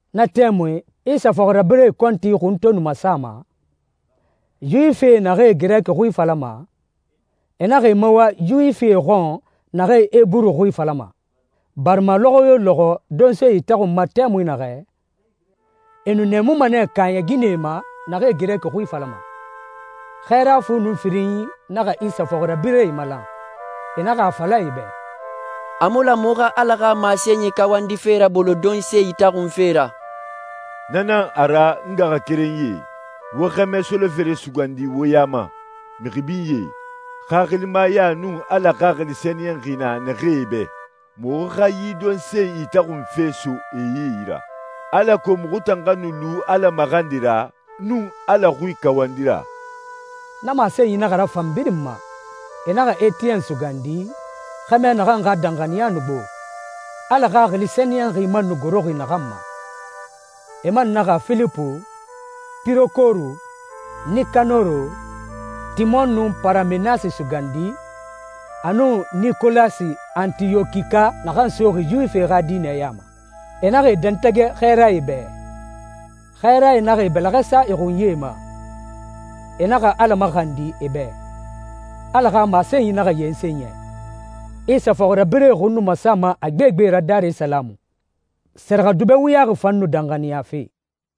Na tɛmui, Isa fɔxirabirɛe kɔnti xun to nu masama, Yuwifie naxee Girɛki xui falama, e naxa e mawa Yuwifie xɔn naxee Eburu xui falama, barima lɔxɔ yo lɔxɔ donse itaxunma tɛmui naxɛ, e nu nɛɛmuma nɛ kaaɲɛ ginɛe ma naxee Girɛki xui falama. Xɛɛra fu nun firinyi naxa Isa fɔxirabirɛe malan, e naxa a fala e bɛ, «A mu lan muxu xa Ala xa masenyi kawandife rabolo donse itaxun fe ra. Na nan a ra, n ngaxakerenyie, wo xɛmɛ solofere sugandi wo ya ma, mixi binyee, xaxilimaya nun Ala Xaxili Sɛniyɛnxi na naxee bɛ. Muxu xa yi donse itaxunfe so e yi ra, alako muxu tan xa nu lu Ala maxandi ra nun Ala xui kawandi ra.» Na masenyi naxa rafan birin ma. E naxa Etiyɛn sugandi, xɛmɛ naxan xa danxaniya nu gbo, Ala Xaxili Sɛniyɛnxi man nu goroxi naxan ma. E man naxa Filipu, Pirokoru, Nikanoro, Timon, nun Paramenasi sugandi, a nun Nikolasi Antiyɔkika naxan soxi Yuwifie xa diinɛ ya ma. E naxa e dɛntɛgɛ xɛɛrae bɛ. Xɛɛrae naxa e bɛlɛxɛ sa e xunyie ma, e naxa Ala maxandi e bɛ. Ala xa masenyi naxa yensen yɛ. Isa fɔxirabirɛe xun nu masama a gbegbe ra Darisalamu. Sɛrɛxɛdubɛ wuyaxi fan nu danxaniyafe.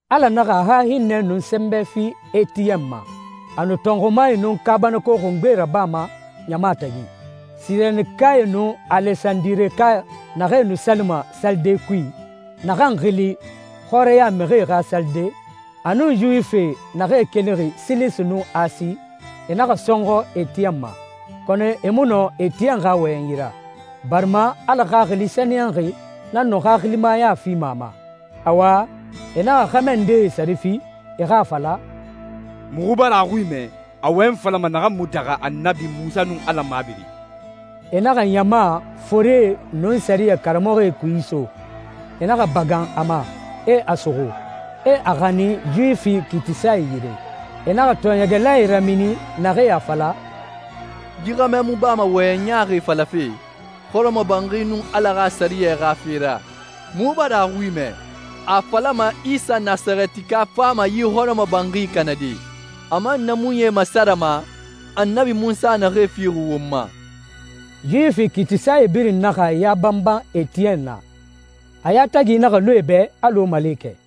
Ala naxa a xa hinnɛ nun sɛnbɛ fi Etiyɛn ma. A nu tɔnxumae nun kaabanako xungbee rabama ɲama tagi. Sirenikae nun Alesandireka naxee nu salima salide kui, naxan xili «xɔrɛya mixi xa salide», a nun Yuwifie naxee kelixi Silisi nun Asi, e naxa sɔnxɔ Etiyɛn ma. Kɔnɔ e mu nɔ Etiyɛn xa wɔyɛnyi ra, barima Ala Xaxili Sɛniyɛnxi nan nu xaxilimaya fima a ma. Awa, e naxa xɛmɛ ndee sare fi, e xa a fala, «Muxu bara a xui mɛ a wɔyɛnyi falama naxan mu daxa Annabi Munsa nun Ala mabiri.» E naxa ɲama, forie, nun sɛriyɛ karamɔxɔe kui iso. E naxa bagan a ma, e a suxu, e a xanin Yuwifi kiitisae yire. E naxa tɔɔɲɛgɛlae ramini, naxee a fala, «Yi xɛmɛ mu bama wɔyɛnyi ɲaaxie falafe hɔrɔmɔbanxi nun Ala xa sɛriyɛ xa fe ra. Muxu bara a xui mɛ, a a falama Isa Nasarɛtika fama yi hɔrɔmɔbanxi kanade, a man naamunyie masarama Annabi Munsa naxee fixi won ma.» Yuwifi kiitisae birin naxa e ya banban Etiyɛn na, a yatagi naxa lu e bɛ alɔ malekɛ.